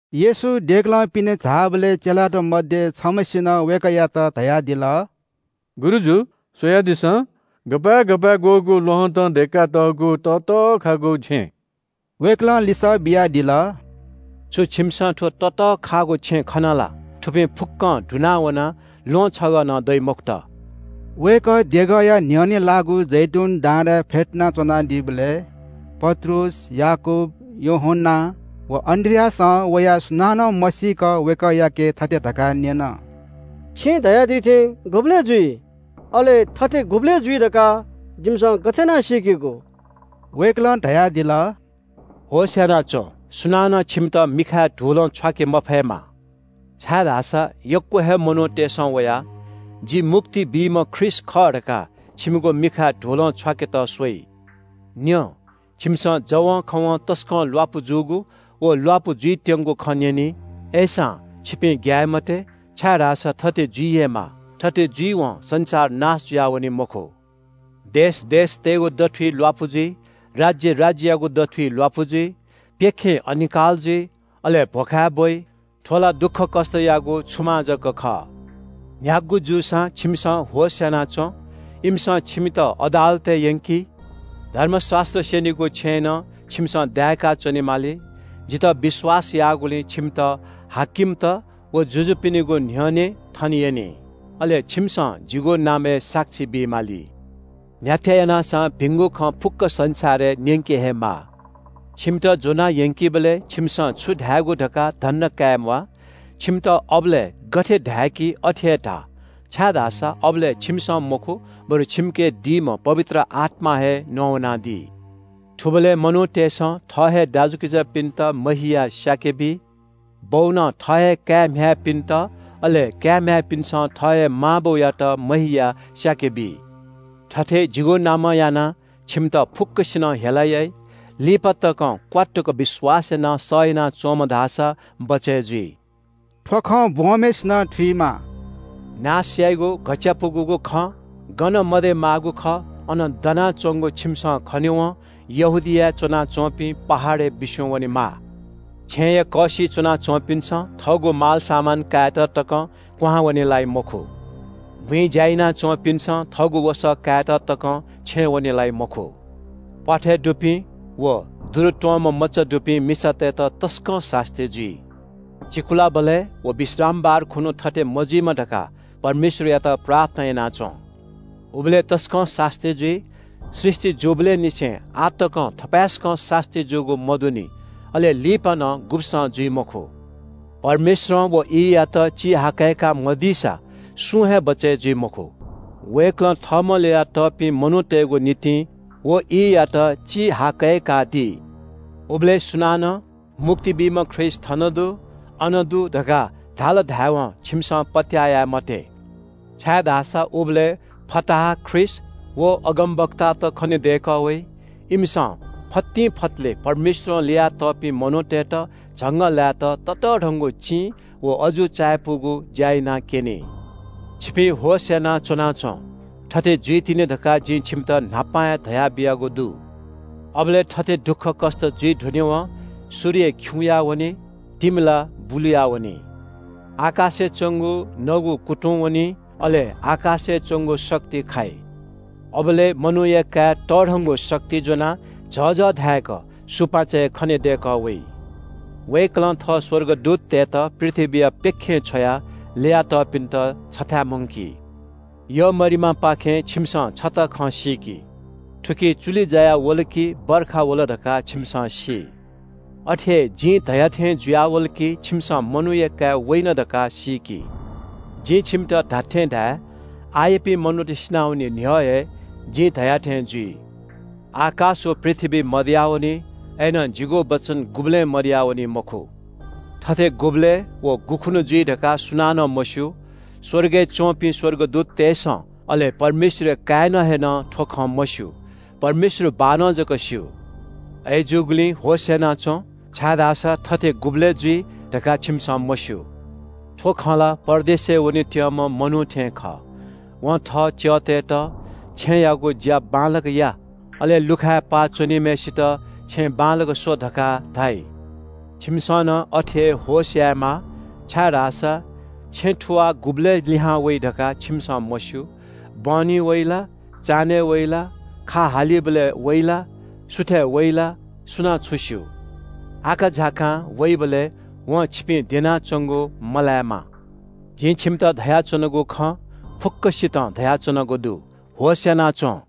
येशू देगलं पिने झाःबलय् चेलात मध्‍ये छम्‍हय्‌सिनं वय्‌कःयात धयादिल – “गुरुजु, स्‍वयादिसँ, गपाय् गपाय्‌ग्‍वःगु ल्‍वहँतं दय्‌कातःगु ततःखाःगु छेँ।” वय्‌कलं लिसः बियादिल – “छु छिमिसं थ्‍व ततःखागु छेँ खना ला? थुपिं फुक्‍कं दुना वनाः ल्‍वहं छगः नं दइ मखुत।” वय्‌कः देगःया न्‍ह्यःने लाःगु जैतून डाँडाय् फ्‍यतुना च्‍वनादीबलय् पत्रुस, याकूब, यूहन्‍ना व अन्‍द्रियासं वयाः सुनानं मसीक वय्‌कःयाके थथे धकाः न्‍यन – “छिं धयादी थें गुबलय् जुइ? अले थथे गुबलय् जुइ धकाः जिमिसं गथे यानाः सीकेगु?” वय्‌कलं धयादिल – “होश‍ यानाच्‍वँ, सुनानं छिमित मिखाय् धुलं छ्वाके मफयेमा, छाय्‌धाःसा यक्‍व हे मनूतय्‌सं वयाः – ‘जि मुक्ति बीम्‍ह ख्रीष्‍ट खः’ धकाः छिमिगु मिखाय् धुलं छ्वाकेत स्‍वइ। न्‍यँ, छिमिसं जवंखवं तसकं ल्‍वापु जूगु व ल्‍वापु जुइत्‍यंगु खँ न्‍यनी। अय्‌सां, छिपिं ग्‍याये मते, छाय्‌धाःसा थथे जुइ हे माः। थथे जुइवं संसार नाश जुयावनी मखु। देश देशतय्‌गु दथुइ ल्‍वापु जुइ। राज्‍य राज्‍ययागु दथुइ ल्‍वापु जुइ। प्‍यखें अनिकाल जुइ, अले भ्‍वखाय् ब्‍वइ। थ्‍व ला दुःखकष्‍टयागु छुमां जक खः।” “न्‍ह्यागु जूसां छिमिसं होश‍ यानाच्‍वँ। इमिसं छिमित अदालतय् यंकी, धर्मशास्‍त्र स्‍यनीगु छेँय् नं छिमिसं दाय्‌काः च्‍वनेमाली। जितः विश्‍वास याःगुलिं छिमित हाकिमत व जुजुपिनिगु न्‍ह्यःने थने यनी, अले छिमिसं जिगु नामय् साक्षी बी माली। न्‍ह्याथे यानाः सां भिंगु खँ फुक्‍क संसारय् न्‍यंके हे माः। छिमित ज्‍वना यंकीबलय् छिमिसं छु धायेगु धकाः धन्‍दा काये म्‍वाः। छिमित अबलय् गथे धाय्‌की अथे हे धा, छाय्‌धाःसा अबलय् छिमिसं मखु, बरु छिमिके दीम्‍ह पवित्र आत्‍मां हे नवानादी। “थुबलय् मनूतय्‌सं थः हे दाजुकिजापिन्‍त महियाः स्‍याके बी। बौनं थः हे काय् म्‍ह्याय्‌पिन्‍त, अले काय् म्‍ह्याय्‌पिन्‍सं थः हे मां बौयात महियाः स्‍याके बी। थथे जिगु नामं यानाः छिमित फुक्‍कसिनं हेला याइ। लिपा तकं क्‍वात्तुक विश्‍वास यानाः सह यानाच्‍वंम्‍ह धाःसा बचय् जुइ।” थ्‍व खँ ब्‍वंम्‍हय्‌सिनं थुइमा – “नाश याइगु घच्‍चायापुगु खँ गन मदयेमाःगु खः अन दनाच्‍वंगु छिमिसं खनेवं यहूदियाय् च्‍वनाच्‍वंपिं पहाडय् बिस्‍युं वनेमा। छेँय्‌या कःसिइ च्‍वनाच्‍वंपिन्‍सं थःगु मालसामान कायेत तकं क्‍वहां वने लाइ मखु। बुँइ ज्‍या याना च्‍वंपिन्‍सं थःगु वसः कायेत तकं छेँय् वने लाइ मखु। प्‍वाथय् दुपिं व दुरुत्‍वंम्‍ह मचा दुपिं मिसातय्‌त तसकं सास्‍ती जुइ। चिकुलाबलय् व विश्रामबार खुन्‍हु थथे मजुइमा धकाः परमेश्‍वरयात प्रार्थना याना च्‍वँ। उबलय् तसकं सास्‍ती जुइ। सृष्‍टि जूबलय् निसें आः तकं थपाय्‌सकं सास्‍ती जूगु मदुनि। अले लिपा नं गुब्‍सं जुइ मखु। परमेश्‍वरं व ईयात चिहाकय्‌का मदीसा सुं हे बचय् जुइ मखु। वय्‌कलं थःम्‍हं ल्‍ययातःपिं मनूतय्‌गु निंतिं व ईयात चिहाकय्‌कादी। “उबलय् सुनानं ‘मुक्ति बीम्‍ह ख्रीष्‍ट थन दु, अन दु’ धकाः धाल धाय्‌वं छिमिसं पत्‍याः याये मते, छाय्‌धाःसा उबलय् फताहा ख्रीष्‍ट व अगमवक्तात खनेदय्‌कः वइ। इमिसं फतिंफतलय् परमेश्‍वरं ल्‍ययातःपिं मनूतय्‌त झंगःलाय्‌त ततःधंगु चिं व अजू चायापुगु ज्‍या यानाक्‍यनी। छिपिं होश यानाः च्‍वनाच्‍वँ, थथे जुइतिनि धकाः जिं छिमित न्‍हापां हे धयाबियागु दु।” “अबलय् थथे दुःखकष्‍ट जुइ धुनेवं – “‘सूर्य खिउँया वनी, तिमिला बुलुयावनी। आकाशय् च्‍वंगु नगु कुतुं वनी। अले आकाशय् च्‍वंगु शक्ति खाइ।’ “अबलय् मनूया काय् तःधंगु शक्ति ज्‍वनाः झःझः धाय्‌क सुपाँचय् खनेदय्‌कः वइ। वय्‌कलं थः स्‍वर्गदूततय्‌त पृथ्‍वीया प्‍यखें छ्वयाः ल्‍ययातःपिन्‍त छथाय् मुंकी।” “यःमरिमापाखें छिमिसं छता खँ सीकि। थुकी चुलि जायावल कि वर्षा वल धकाः छिमिसं सी। अथे हे जिं धया थें जुयावल कि छिमिसं मनूया काय् वइन धकाः सीकि। जिं छिमित धात्‍थें धाये – आःयापिं मनूत सिनावने न्‍ह्यः हे जिं धया थें जुइ। आकाश व पृथ्‍वी मदयावनी, अय्‌नं जिगु वचन गुबलें मदयावनी मखु।” “थथे गुबलय् व गुखुन्‍हु जुइ धकाः सुनानं मस्‍यू। स्‍वर्गय् च्‍वंपिं स्‍वर्गदूततय्‌सं, अले परमेश्‍वरया काय्‌नं हे नं थ्‍व खँ मस्‍यू। परमेश्‍वर बाःनं जक स्‍यू। अय्‌जूगुलिं होश‍यानाच्‍वँ, छाय्‌धाःसा थथे गुबलय् जुइ धकाः छिमिसं मस्‍यू। “थ्‍व खँ ला परदेशय् वनेत्‍यंम्‍ह मनू थें खः। वं थः च्‍यःतय्‌त ‘छेँयागु ज्‍या बांलाक या,’ अले लुखाय् पाः च्‍वनीम्‍हय्‌सित ‘छेँय् बांलाक स्‍व’ धकाः धाइ। छिमिसं नं अथे हे होश यायेमाः, छाय्‌धाःसा छेँ थुवाः गुबलय् लिहां वइ धकाः छिमिसं मस्‍यू। बहनी वइ ला, चान्‍हय् वइ ला, खा हालीबलय् वइ ला, सुथय् वइ ला, सुनां छु स्‍यू? आकाझाकां वइबलय् वं छिपिं द्यनाच्‍वंगु मलायेमा। जिं छिमित धयाच्‍वनागु खँ फुक्‍कसितं धयाच्‍वनागु दु – ‘होश‍यानाच्‍वँ।’”